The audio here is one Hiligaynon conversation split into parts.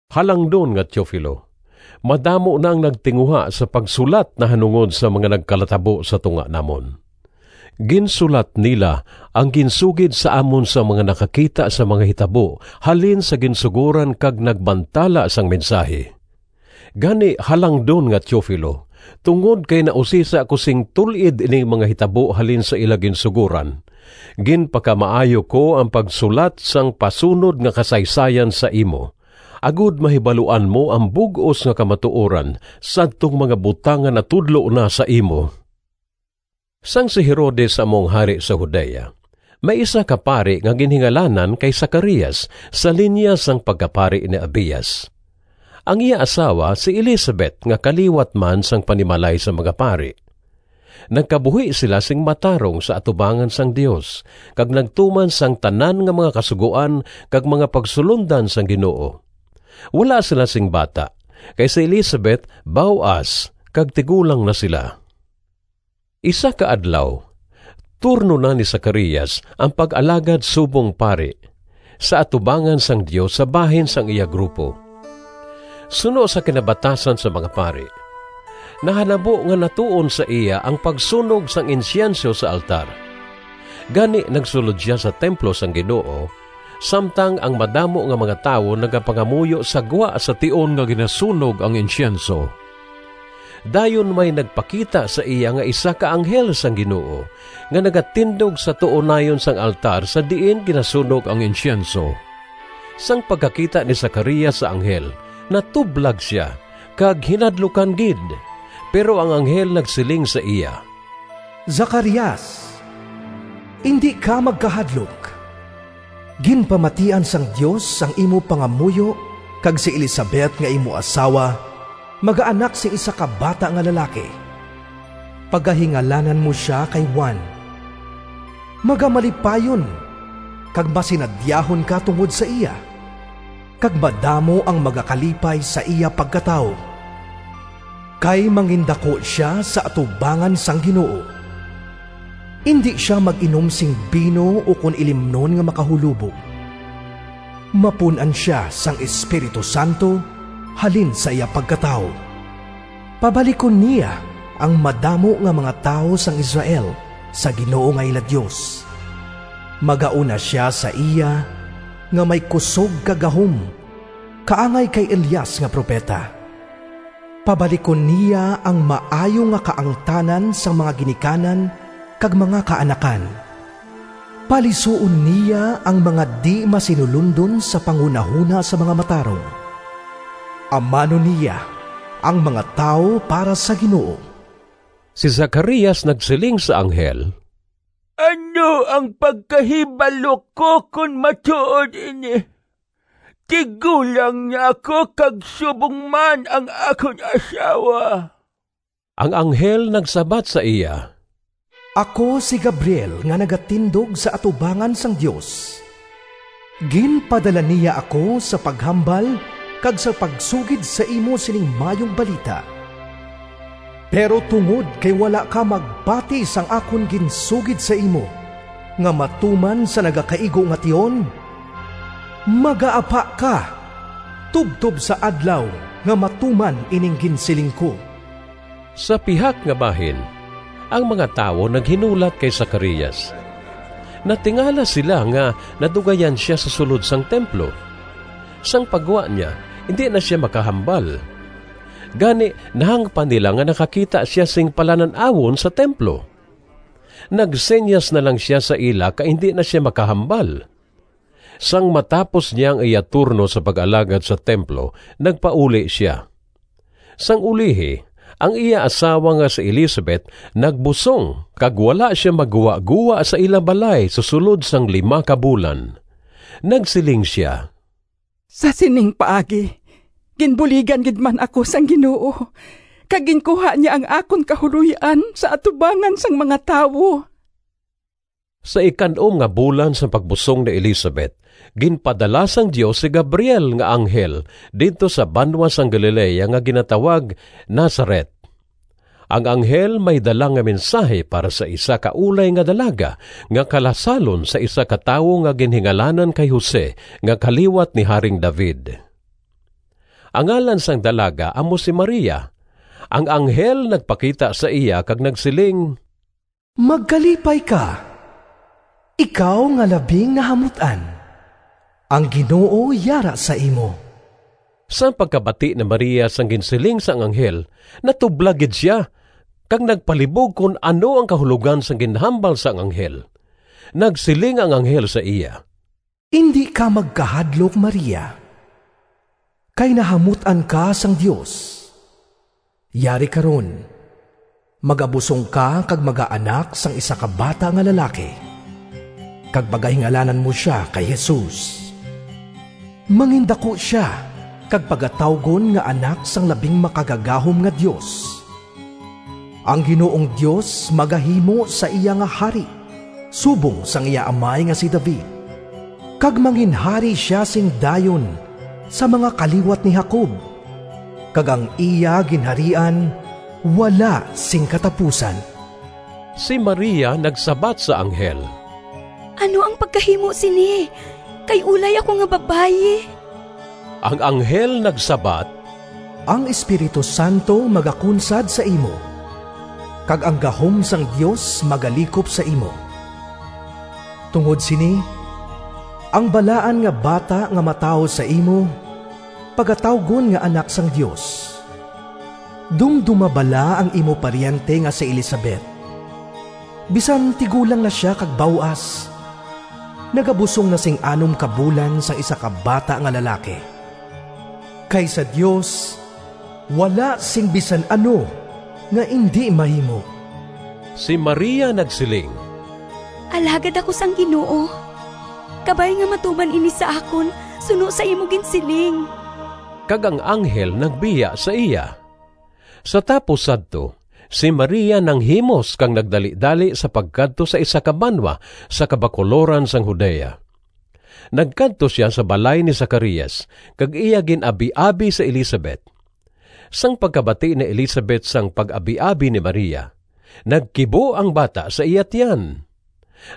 Halangdon nga Teofilo, Madamo na ang nagtinguha sa pagsulat nahanungod sang mga nagkalatabo sa tunga namon. Ginsulat nila ang ginsugid sa amon sang mga nakakita sang mga hitabo halin sa ginsugoran kag nagbantala sang mensahi. Gani, halangdon nga Teofilo, tungod kay nausisa ko sing tul-id ining mga hitabo halin sa ila ginsugoran, ginpakamaayo ko ang pagsulat sang pasunod nga kasaysayan sa imo, agod mahibaluan mo ang bug-os nga kamatuoran sadtong mga butang nga natudlo na sa imo. Sang si Herodes amo ang hari sa Judea, may isa ka pari nga ginhingalanan kay Zacarias sa linya sang pagkapari ni Abias. Ang iya asawa si Elisabet nga kaliwat man sang panimalay sang mga pari. Nagkabuhi sila sing matarong sa atubangan sang Dios, kag nagtuman sang tanan nga mga kasugoan kag mga pagsulondan sang Ginoo. Wala sila sing bata kay si Elisabet baw-as kag tigulang na sila. Isa ka adlaw, turno na ni Zacarias ang pag-alagad subong pari sa atubangan sang Dios sa bahin sang iya grupo. Suno sa kinabatasan sang mga pari, nahanabo nga natuon sa iya ang pagsunog sang insyenso sa altar. Gani nagsulod sia sa templo sang Ginoo, samtang ang madamo nga mga tawo nagapangamuyo sa gwa sa tion nga ginasunog ang insyenso. Dayon may nagpakita sa iya nga isa ka anghel sang Ginoo nga nagatindog sa tuo nayon sang altar sa diin ginasunog ang insyenso. Sang pagkakita ni Zacarias sa anghel natublag sia kag hinadlukan gid. Pero ang anghel nagsiling sa iya, “Zacarias, indi ka magkahadlok! Ginpamatian sang Dios ang imo pangamuyo kag si Elisabet nga imo asawa magaanak sing isa ka bata nga lalaki. Pagahingalanan mo sia kay Juan. Magamalipayon kag masinadyahon ka tungod sa iya, kag madamo ang magakalipay sa iya pagkatawo! Kay mangindaku sia sa atubangan sang Ginoo. Indi sia mag-inom sing bino ukon ilimnon nga makahulobog. Mapun-an sia sang Espiritu Santo halin sa iya pagkatawo. Pabalikon niya ang madamo nga mga tawo sang Israel sa Ginoo nga ila Dios. Magauna sia sa iya nga may kusog kag gahom kaangay kay Elias nga propeta. Pabalikon niya ang maayo nga kaangtanan sang mga ginikanan kag mga kaanakan. Palisuon niya ang mga di-masinulondon sa panghunahona sang mga matarong. Amanon niya ang mga tawo para sa Ginoo.” Si Zacarias nagsiling sa anghel, “Ano ang pagkahibalo ko kon matuod ini? Tigulang na ako kag subong man ang akon asawa.” Ang anghel nagsabat sa iya, “Ako si Gabriel nga nagatindog sa atubangan sang Dios. Ginpadala niya ako sa paghambal kag sa pagsugid sa imo sining maayong balita. Pero tungod kay wala ka magpati sang akon ginsugid sa imo nga matuman sa nagakaigo nga tion, magaapa ka tubtob sa adlaw nga matuman ining ginsiling ko.” Sa pihak nga bahin, ang mga tawo naghinulat kay Zacarias. Natingala sila nga nadugayan sia sa sulod sang templo. Sang paggwa niya indi na sia makahambal. Gani nahangpan nila nga nakakita sia sing palanan-awon sa templo. Nagsinyas na lang sia sa ila kay indi na sia makahambal. Sang matapos niya ang iya turno sa pag-alagad sa templo nagpauli sia. Sang ulihi ang iya asawa nga si Elisabet nagbusong kag wala sia magguwagowa sa ila balay sa sulod sang lima ka bulan. Nagsiling sia, “Sa sining paagi ginbuligan gid man ako sang Ginoo kag ginkuha niya ang akon kahuloy-an sa atubangan sang mga tawo.” Sa ikan-om nga bulan sang pagbusong ni Elisabet ginpadala sang Dios si Gabriel nga anghel didto sa banwa sang Galilea nga ginatawag Nazaret. Ang anghel may dala nga mensahi para sa isa ka ulay nga dalaga nga kalasalon sa isa ka tawo nga ginhingalanan kay Jose nga kaliwat ni Haring David. Ang ngalan sang dalaga amo si Maria. Ang anghel nagpakita sa iya kag nagsiling, “Magkalipay ka! Ikaw nga labing nahamut-an, ang Ginoo yara sa imo!” Sang pagkabati ni Maria sang ginsiling sang anghel natublag gid sia, kag nagpalibog kon ano ang kahulogan sang ginhambal sang anghel. Nagsiling ang anghel sa iya, “Indi ka magkahadlok, Maria, kay nahamut-an ka sang Dios. Yari karon, magabusong ka kag magaanak sang isa ka bata nga lalaki, kag pagahingalanan mo sia kay Jesus. Mangindaku sia kag pagatawgon nga Anak sang Labing Makagagahom nga Dios. Ang Ginoong Dios magahimo sa iya nga hari subong sang iya amay nga si David, kag manginhari sia sing dayon sa mga kaliwat ni Jacob kag ang iya ginharian wala sing katapusan.” Si Maria nagsabat sa anghel, “Ano ang pagkahimo sini, kay ulay ako nga babayi?” Ang anghel nagsabat, “Ang Espiritu Santo magakunsad sa imo, kag ang gahom sang Dios magalikop sa imo. Tungod sini ang balaan nga bata nga matawo sa imo pagatawgon nga Anak sang Dios. Dumdoma bala ang imo paryente nga si Elisabet. Bisan tigulang na sia kag baw-as, nagabusong na sing anom ka bulan sang isa ka bata nga lalaki. Kay sa Dios wala sing bisan ano nga indi mahimo.” Si Maria nagsiling, “Alagad ako sang Ginoo. Kabay nga matuman ini sa akon suno sa imo ginsiling.” Kag ang anghel nagbiya sa iya. Sa tapos sadto si Maria nanghimos kag nagdalidali sa pagkadto sa isa ka banwa sa kabakuloran sang Judea. Nagkadto sia sa balay ni Zacarias kag iya gin-abiabi si Elisabet. Sang pagkabati ni Elisabet sang pag-abiabi ni Maria, nagkibo ang bata sa iya tiyan.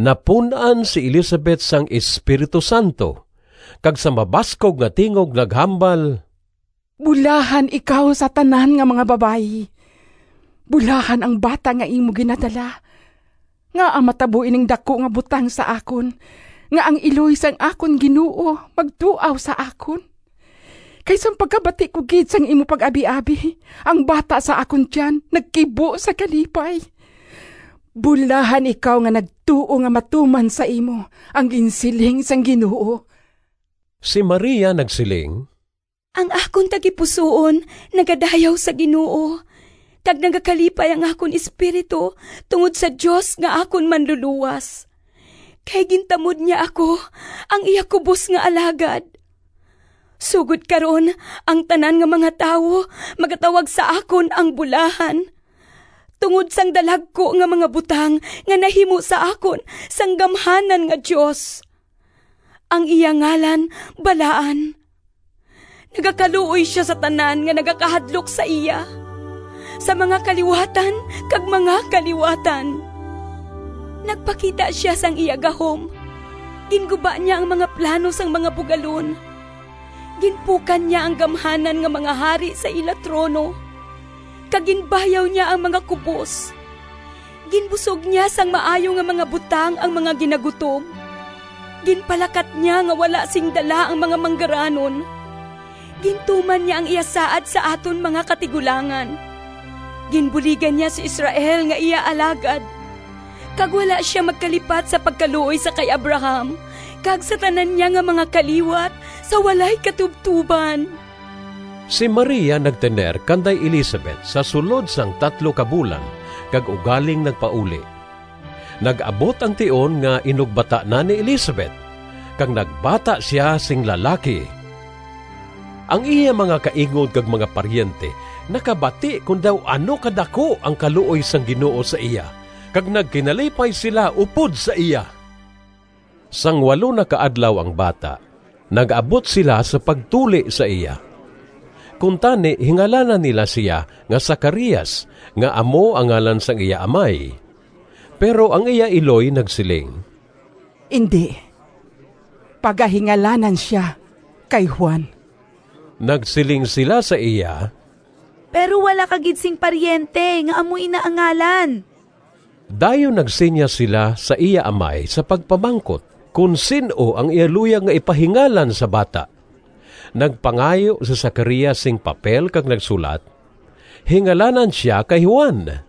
Napun-an si Elisabet sang Espiritu Santo, kag sa mabaskog nga tingog naghambal, “Bulahan ikaw sa tanan nga mga babayi! Bulahan ang bata nga imo ginadala! Ngaa matabo ining daku nga butang sa akon, nga ang iloy sang akon Ginoo magduaw sa akon? Kay sang pagkabati ko gid sang imo pag-abiabi, ang bata sa akon tiyan nagkibo sa kalipay. Bulahan ikaw nga nagtuo nga matuman sa imo ang ginsiling sang Ginoo.” Si Maria nagsiling: “Ang akon tagipusoon Nagadayaw sa Ginoo, Kag nagakalipay ang akon espiritu Tungod sa Dios nga akon Manlulowas. Kay gintamod niya ako, Ang iya kubos nga alagad! Sugod karon ang tanan nga mga tawo Magatawag sa akon ang bulahan, Tungod sang dalagku nga mga butang Nga nahimo sa akon Sang Gamhanan nga Dios. Ang iya ngalan balaan. Nagakaluoy sia sa tanan Nga nagakahadlok sa iya, Sa mga kaliwatan kag mga kaliwatan. Nagpakita sia sang iya gahom, Ginguba niya Ang mga plano sang mga bugalon. Ginpukan niya Ang gamhanan nga mga hari Sa ila trono, Kag ginbayaw niya ang mga kubos. Ginbusog niya Sang maayo nga mga butang Ang mga ginagutom, Ginpalakat niya nga wala sing dala Ang mga manggaranon. Gintuman niya Ang iya saad sa aton mga katigulangan; Ginbuligan niya si Israel Nga iya alagad, Kag wala sia magkalipat Sa pagkaluoy sa kay Abraham Kag sa tanan niya nga mga kaliwat Sa walay katubtoban!” Si Maria nagtener kanday Elisabet sa sulod sang tatlo ka bulan, kag ugaling nagpauli. Nag-abot ang tion nga inugbata na ni Elisabet, kag nagbata sia sing lalaki. Ang iya mga kaingod kag mga paryente nakabati kon daw ano kadaku ang kaluoy sang Ginoo sa iya kag nagkinalipay sila upod sa iya. Sang walo na ka adlaw ang bata, nag-abot sila sa pagtuli sa iya. Kuntani hingalanan nila sia nga Zacarias nga amo ang ngalan sang iya amay. Pero ang iya iloy nagsiling, “Indi! Pagahingalanan sia kay Juan.” Nagsiling sila sa iya, “Pero wala ka gid sing paryente nga amo ina ang ngalan!” Dayon nagsinyas sila sa iya amay sa pagpamangkot kon sin-o ang iya luyag nga ipahingalan sa bata. Nagpangayo si Zacarias sing papel kag nagsulat, “Hingalanan sia kay Juan.”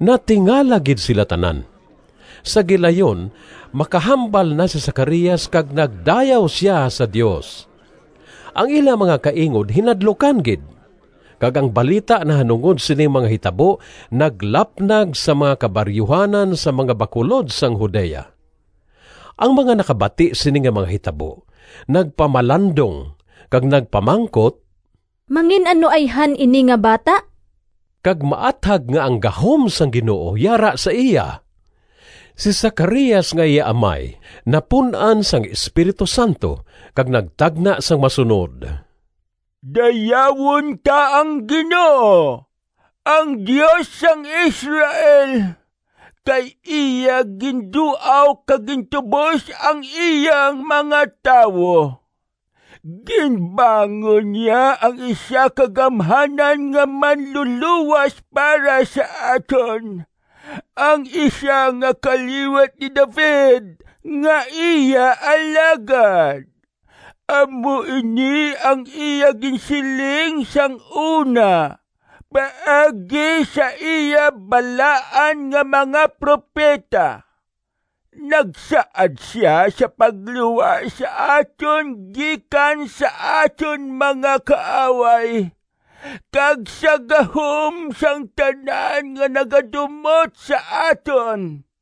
Natingala gid sila tanan. Sa gilayon makahambal na si Zacarias kag nagdayaw sia sa Dios. Ang ila mga kaingod hinadlukan gid, kag ang balita nahanungod sining mga hitabo naglapnag sa mga kabaryuhanan sa mga bakulod sang Judea. Ang mga nakabati sini nga mga hitabo nagpamalandong kag nagpamangkot, “Mangin-ano ayhan ini nga bata?” Kag maathag nga ang gahom sang Ginoo yara sa iya. Si Zacarias nga iya amay napun-an sang Espiritu Santo kag nagtagna sang masunod: “Dayawon ta ang Ginoo, Ang Dios sang Israel! Kay iya ginduaw kag gintubos Ang iya mga tawo. Ginbangon niya Ang isa ka gamhanan nga Manlulowas Para sa aton, Ang isa nga kaliwat ni David Nga iya alagad. Amo ini ang iya ginsiling sang una Paagi sa iya balaan nga mga propeta: Nagsaad sia sa pagluwas sa aton Gikan sa aton mga kaaway, Kag sa gahom sang tanan Nga nagadumot sa aton.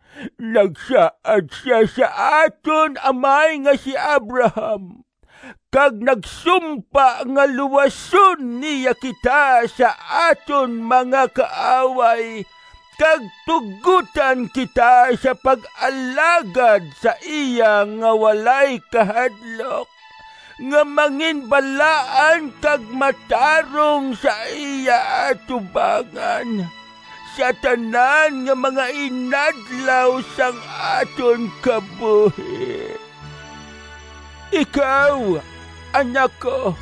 Nagsaad sia sa aton amay Nga si Abraham, Kag nagsumpa nga luwason niya kita Sa aton mga kaaway, Kag tugotan kita sa pag-alagad sa iya Nga walay kahadlok, Nga manginbalaan kag matarong Sa iya atubangan, Sa tanan nga mga inadlaw Sang aton kabuhi. Ikaw, anak ko,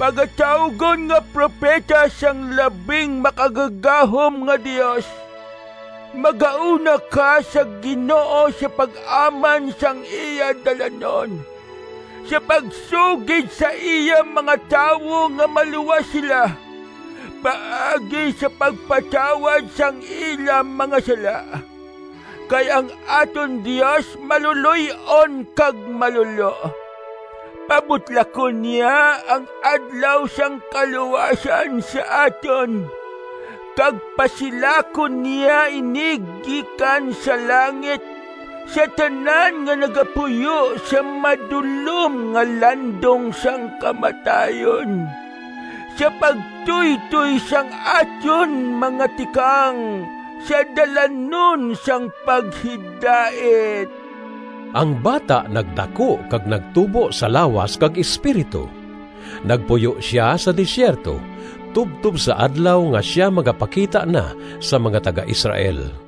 Pagatawgon nga propeta Sang Labing Makagagahom nga Dios, Magauna ka sa Ginoo Sa pag-aman sang iya dalanon, Sa pagsugid sa iya mga tawo Nga maluwas sila, Paagi sa pagpatawad Sang ila mga sala. Kay ang aton Dios Maluloy-on kag malulo. Pabutlakon niya Ang adlaw sang kaluwasan sa aton, Kag pasilakon niya ini Gikan sa langit Sa tanan nga nagapuyo sa madulom Nga landong sang kamatayon, Sa pagtuytoy sang aton mga tikang Sa dalanon sang paghidait.” Ang bata nagdaku kag nagtubo sa lawas kag espiritu. Nagpuyo sia sa desierto tubtob sa adlaw nga sia magapakita na sa mga taga-Israel.